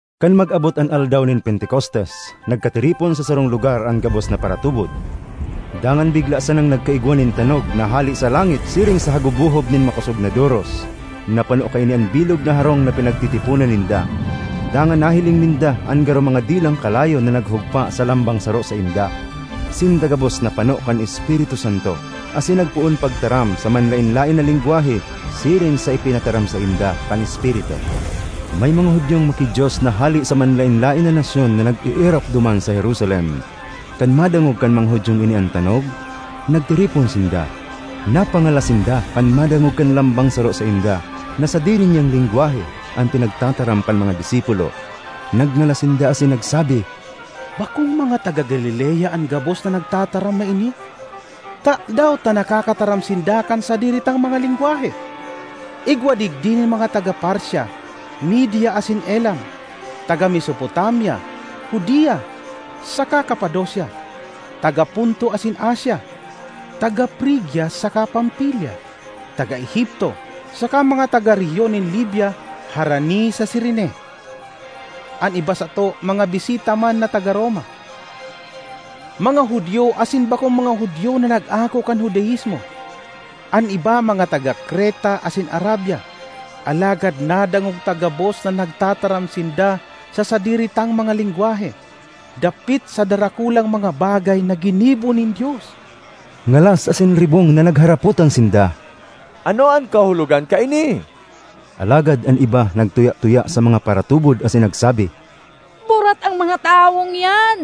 Kan mag-abot an aldaw nin Pentecostes, nagkatiripon sa sarong lugar an gabos na paratubod. Dangan bigla sanang nagkaigwa nin tanog na hale sa langit siring sa hagubohob nin makosog na doros; napano kaini an bilog na harong na pinagtitiponan ninda. Dangan nahiling ninda an garo mga dilang kalayo na naghugpa sa lambang saro sainda. Sinda gabos napano kan Espiritu Santo asin nagpoon pagtaram sa manlaen-laen na lengwahe, siring sa ipinataram sainda kan Espiritu. May mga Judiong maki-Dios na hale sa manlaen-laen na nasyon na nag-eerok duman sa Jerusalem. Kan madangog kan mga Judiong ini an tanog, nagtiripon sinda. Napangalas sinda kan madangog kan lambang saro sainda na sadiri niyang lengwahe an pinagtataram kan mga disipulo. Nagngalas sinda asin nagsabi, “Bakong mga taga Galilea an gabos na nagtataram na ini? Tadaw ta nakakataram sinda kan sadiri tang mga lengwahe? Igwa digdi nin mga taga Partia, Media asin Elam; taga Mesopotamia, Judea, saka Capadocia; taga Ponto asin Asia, taga Frigia saka Pamfilia, taga Egipto saka mga taga rehiyon nin Libya harani sa Cirene. An iba sato mga bisita man na taga Roma, mga Judio asin mga bakong Judio na nag-ako kan Judaismo; an iba mga taga Creta asin Arabia—alagad nadangog ta gabos na nagtataram sinda sa sadiri tang mga lengwahe dapit sa darakulang mga bagay na ginibo nin Dios!” Ngalas asin ribong na nagharapotan sinda, “Ano an kahulogan kaini?” Alagad an iba nagtuya-tuya sa mga paratubod asin nagsabi, “Burat an mga tawong iyan!”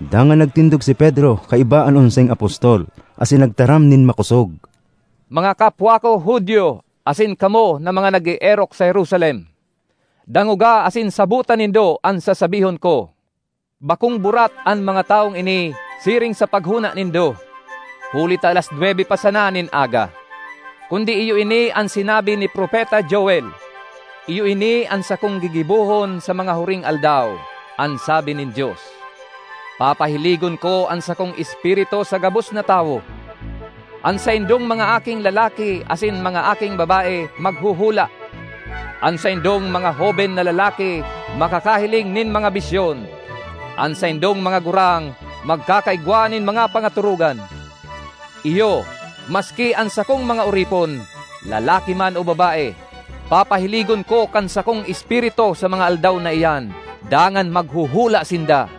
Dangan nagtindog si Pedro kaiba an onseng apostol, asin nagtaram nin makosog, “Mga kapwa ko Judio asin kamo na mga nag-eerok sa Jerusalem, dangoga asin sabota nindo an sasabihon ko. Bakong burat an mga tawong ini siring sa paghona nindo, huli ta alas nwebe pa sana nin aga. Kundi iyo ini an sinabi ni propeta Joel, ‘Iyo ini an sakong gigibohon sa mga huring aldaw, an sabi nin Dios: Papahiligon ko an sakong Espiritu sa gabos na tawo. An saindong mga aking lalaki asin mga aking babae maghuhula; an saindong mga hoben na lalaki makakahiling nin mga bisyon; an saindong mga gurang magkakaigwa nin mga pangatorogan. Iyo, maski an sakong mga oripon, lalaki man o babae, papahiligon ko kan sakong Espiritu sa mga aldaw na iyan, dangan maghuhula sinda.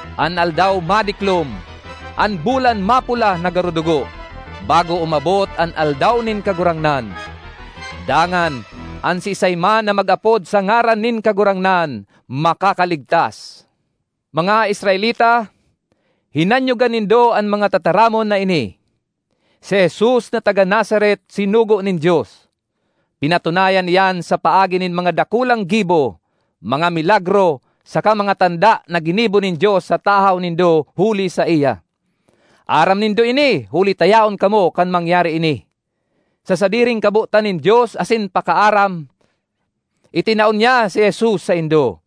an aldaw madiklom, an bulan mapula na garo dugo, bago umabot an Aldaw nin Kagurangnan. Dangan, an siisay man na mag-apod sa ngaran nin Kagurangnan, makakaligtas.’ ”Mga Israelita, hinanyoga nindo an mga tataramon na ini! Si Jesus na taga Nazaret sinugo nin Dios. Pinatunayan iyan sa paagi nin mga dakulang gibo, mga milagro, saka mga tanda na ginibo nin Dios sa tahaw nindo huli saiya. Aram nindo ini huli ta yaon kamo kan mangyari ini. Sa sadiring kabotan nin Dios asin pakaaram, itinao niya si Jesus saindo.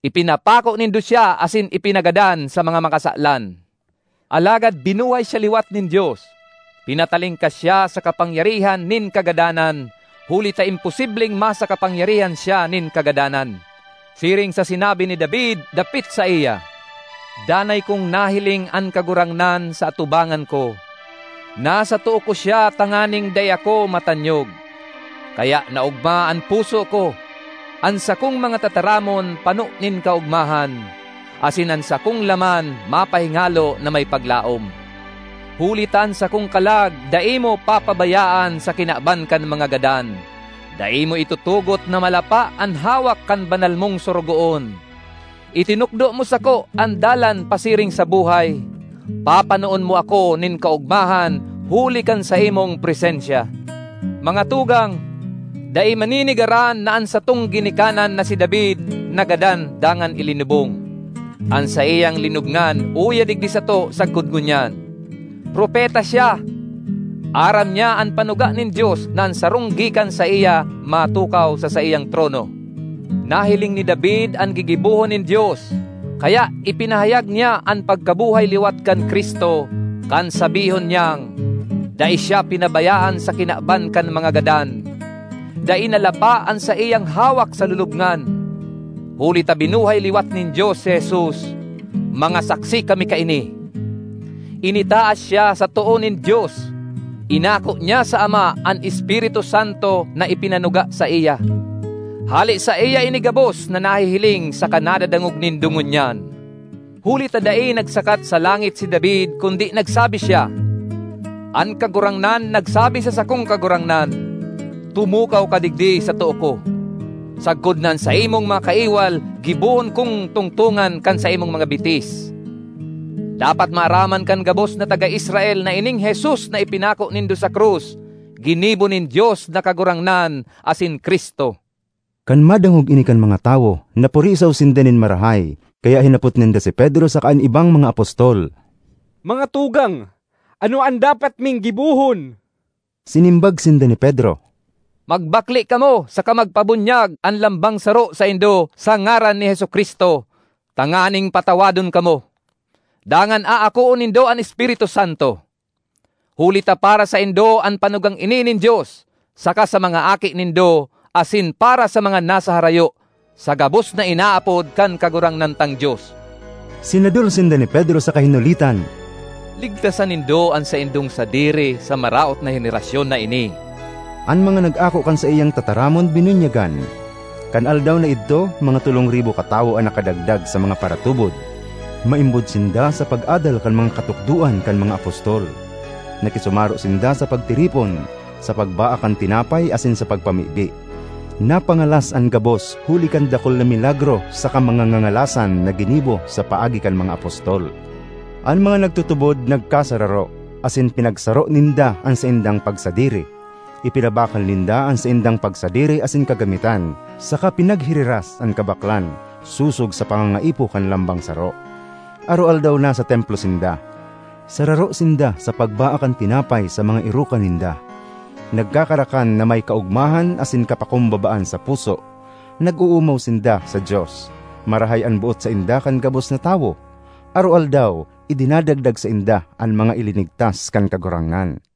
Ipinapako nindo siya asin ipinagadan sa mga makasalan. Alagad binuhay siya liwat nin Dios. Pinatalingkas siya sa kapangyarihan nin kagadanan, huli ta imposibleng masa kapangyarihan siya nin kagadanan. Siring sa sinabi ni David dapit saiya, ‘Danay kong nahiling an Kagurangnan sa atubangan ko; nasa too ko siya tanganing dai ako matanyog. Kaya naogma an puso ko, an sakong mga tataramon pano nin kaogmahan; asin an sakong laman mapahingalo na may paglaom; huli ta an sakong kalag dai mo papabayaan sa kinaban kan mga gadan, dai mo itutugot na malapa an hawak kan Banal mong Sorogoon. Itinukdo mo sako an dalan pasiring sa buhay, papanoon mo ako nin kaogmahan huli kan saimong presensya. ”Mga tugang, dai manenegaran na an satong ginikanan na si David nagadan dangan ilinubong; an saiyang linubngan uya digdi sato sagkod ngunyan. Propeta siya; aram niya an panuga nin Dios na an sarong gikan saiya matukaw sa saiyang trono: Nahiling ni David an gigibohon nin Dios, kaya ipinahayag niya an pagkabuhay liwat kan Cristo, kan sabihon niyang, ‘Dai siya pinabayaan sa kinaban kan mga gadan; dai nalapa an saiyang hawak sa lulubngan.’ Huli ta binuhay liwat nin Dios si Jesus; mga saksi kami kaini. Initaas siya sa too nin Dios; inako niya sa Ama an Espiritu Santo na ipinanuga saiya. Hale saiya ini gabos na nahihiling saka nadadangog nindo ngunyan. Huli ta dai nagsakat sa langit si David kundi nagsabi siya, ‘An Kagurangnan nagsabi sa sakong Kagurangnan: Tumukaw ka digdi sa too ko, sagkod na an saimong mga kaiwal gibohon kong tungtongan kan saimong mga bitis.’ ”Dapat maaraman kan gabos na taga Israel na ining Jesus na ipinako nindo sa krus ginibo nin Dios na Kagurangnan asin Cristo!” Kan madangog ini kan mga tawo, napurisaw sinda nin marahay, kaya hinapot ninda si Pedro saka an ibang mga apostol, “Mga tugang, ano an dapat ming gibohon?” Sinimbag sinda ni Pedro, “Magbakle kamo saka magpabunyag an lambang saro saindo sa ngaran ni Jesu-Cristo, tanganing patawadon kamo; dangan aakoon nindo an Espiritu Santo. Huli ta para saindo an panugang ini nin Dios, saka sa mga aki nindo asin para sa mga nasa harayo—sa gabos na inaapod kan Kagurangnan tang Dios.” Sinadol sinda ni Pedro saka hinulitan, “Ligtasan nindo an saindong sadiri sa maraot na henerasyon na ini!” An mga nag-ako kan saiyang tataramon binunyagan. Kan aldaw na idto mga tolong ribo katawo an nakadagdag sa mga paratubod. Maimbod sinda sa pag-adal kan mga katukdoan kan mga apostol; nakisumaro sinda sa pagtiripon, sa pagbaak kan tinapay asin sa pagpamibi. Napangalas an gabos huli kan dakul na milagro saka mga ngangalasan na ginibo sa paagi kan mga apostol. An mga nagtutubod nagkasararo, asin pinagsaro ninda an saindang pagsadiri. Ipinabakal ninda an saindang pagsadiri asin kagamitan saka pinaghiriras an kabaklan sosog sa pangangaipo kan lambang saro. Aroaldaw nasa Templo sinda. Sararo sinda sa pagbaak kan tinapay sa mga erokan ninda, nagkakarakan na may kaogmahan asin kapakumbabaan sa puso. Nag-oomaw sinda sa Dios; marahay an boot sainda kan gabos na tawo. Aroaldaw idinadagdag sainda an mga ilinigtas kan Kagurangnan.